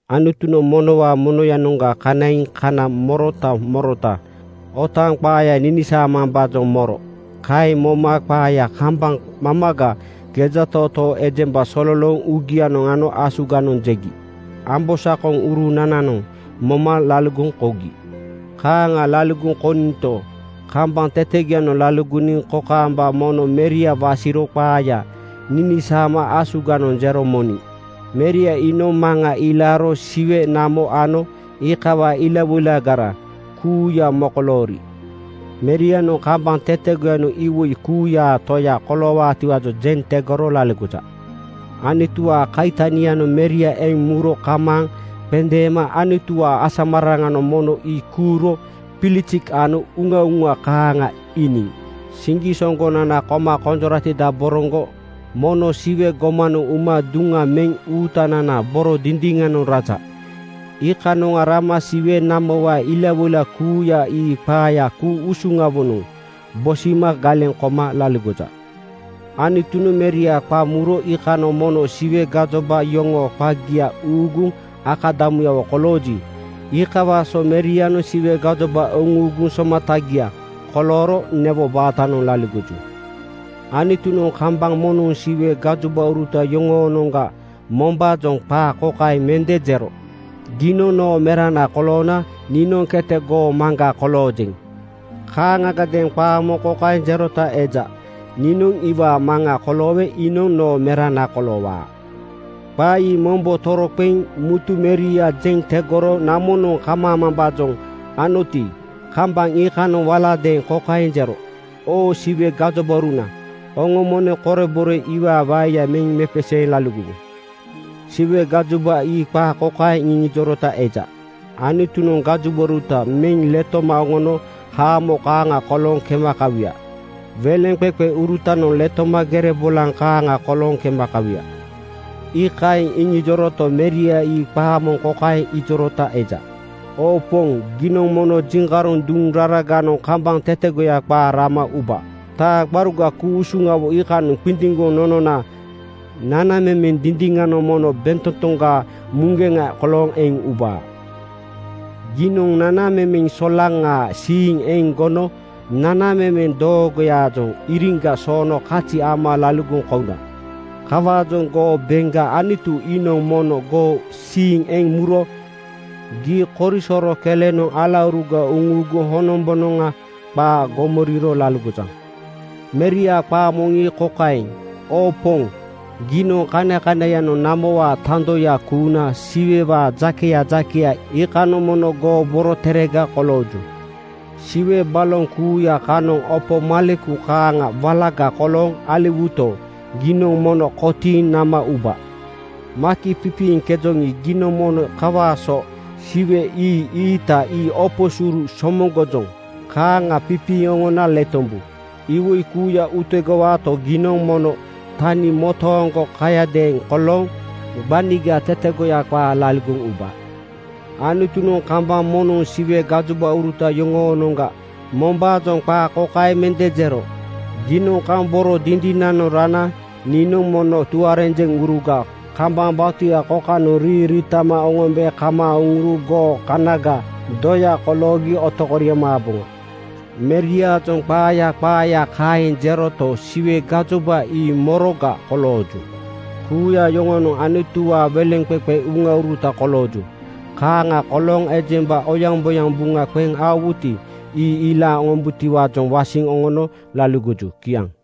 Anutunoŋ monowaa monoyanoŋga kanaiŋ kana morota morota otaaŋ qaaya ninisaamambaajoŋ moro. Kaeŋ moma qaaya kambaŋ mamaga gejatootoo ejemba sololooŋ uugianoŋ ano asuganoŋ jegi ambosakoŋurunananoŋ moma laligoŋ kougi. Kaaŋ laligoŋ kougito, kambaŋ tetegoyanoŋ laligoniŋ kokaamba mono Meria wasiro qaaya ninisaama asuganoŋ jero moniŋ. Meria iinoŋ Maŋa ilaaro Siwe, namo ano iikawaa ilawoilagara kuuya mokoloori Merianoŋ kambaŋ tetegoyanoŋ iwoi kuuyaa Toya koloowaatiwaajoŋ jeŋ tegoro laligoja. Anutuwaa kaitanianoŋ Meria eŋ muro kamaaŋ qendeeno. Anutuwaa asamararaŋanoŋ mono ii kuuro bilisik ano uŋauŋa kaaŋa iiniŋ. Siŋgisoŋgonana koma konjoratidaboroŋgo mono Siwe gomanoŋ uma duŋa meŋ Uutananaa boro dindiŋanoŋ raja. Iikanoŋ rama Siwe namowaa ilawoila kuuya ii qaaya ku-usuŋawonoŋ bosima galeŋ koma laligoja. Anutunoŋ Meria qa muro iikanoŋ mono Siwe gajoba yoŋoo qagia uuguŋ akadamuyawo kolooji, iikawaa so Merianoŋ Siwe gajoba uŋuuguŋ somatagia kolooro newo baatanoŋ laligoju. Anutunoŋ kambaŋ moŋnoŋ Siwe gajobauruta yoŋoonoŋga mombaajoŋ qaa kokaeŋ mende jero, “Giinoŋ noo Merana koloona niinoŋ kete goo Maŋga koloojeŋ.” Kaaŋagadeeŋ qaa moŋ kokaeŋ jerota eja, “Niinoŋ iwaa Maŋa koloowe iinoŋ noo Merana koloowaa.” Qaa ii mombo toroqeŋ mutu Meria jeŋ tegoro namonoŋ kamaamambaajoŋ anoti, kambaŋ iikanoŋ waladeeŋ kokaeŋ jero, “Oo Siwe gajobauruna, oŋo mono korebore iwaa waeya meŋ mepeseeŋ laligowu.” Siwe gajoba ii qaa kokaeŋ iŋijorota eja, “Anutunoŋ gajobauruta meŋ letoma oŋono haamo kaaŋa kolooŋ kema kawuya. Weleŋqeqeurutanoŋ letoma gere bolaŋ kaaŋa kolooŋ kema kawuya.” Ii kaeŋ iŋijoroto, Meria ii qaa moŋ kokaeŋ ijorota eja, “Oo Poŋ, giinoŋ mono jiŋkaroŋ duŋ raraganoŋ kambaŋ tetegoya qaa rama uba. Taa gbaruga ku-usuŋawo iikanoŋ qindiŋgoŋ nonona nanamemeŋ dindiŋanoŋ mono bentotoŋgaa muŋgeŋa kolooŋ eŋ ubaa. Giinoŋ nanamemeŋ solaŋaa siiŋ eŋ gono nanamemeŋ doogoyaajoŋ iriŋga soono kazi ama laligoŋ kouna. Kawaajoŋ goo beŋga Anutu iinoŋ mono goo siiŋ eŋ muro gii korisoro kelenoŋ alauruga uŋuuguŋ honombonoŋa qaa gomoriro laligojaŋ.” Meriaa qaa moŋ ii kokaeŋ, “Oo Poŋ, giinoŋ kanakanaiyanoŋ namowaa tandoya kuuna Siwewaa jakeya jakeya iikanoŋ mono goo boroterega kolooju. Siwe baloŋ kuuya kanoŋ opo maleku kaaŋa walaga kolooŋ aliwuyato, giinoŋ mono kotiiŋ nama uba. Maki pipiiŋkejoŋi, giinoŋ mono kawaa so siwe ii-iita ii opo suru somoŋgojoŋ kaaŋa pipiiŋ oŋona letombu. Iwoi kuuya utegowaato, giinoŋ mono tani motooŋgo kayadeeŋ kolooŋ gbaniga tetegoya qaa laligoŋ uba.” Anutunoŋ kambaŋ moŋnoŋ Siwe gajobauruta yoŋoonoŋga mombaajoŋ qaa kokaeŋ mende jero, “Giinoŋ kaŋ boro dindinanoŋ rana niinoŋ mono tuarenjeŋuruga kambaŋ batuya kokanoŋ riiŋ riitama oŋombe kamaaŋ uŋuro goo kanagaa doya koloogi otokoriaŋ maaboŋa.” Meriaajoŋ qaaya qaaya kaeŋ jeroto, Siwe gajoba ii moroga kolooju? Kuuya yoŋonoŋ Anutuwaa weleŋqeqe uŋauruta kolooju. Kaaŋa kolooŋ ejemba oyaŋboyaŋ buŋa qeŋ aowuti, ii ilaaŋ oŋombutiwaajoŋ wasiŋ oŋono laligoju. Kiaŋ.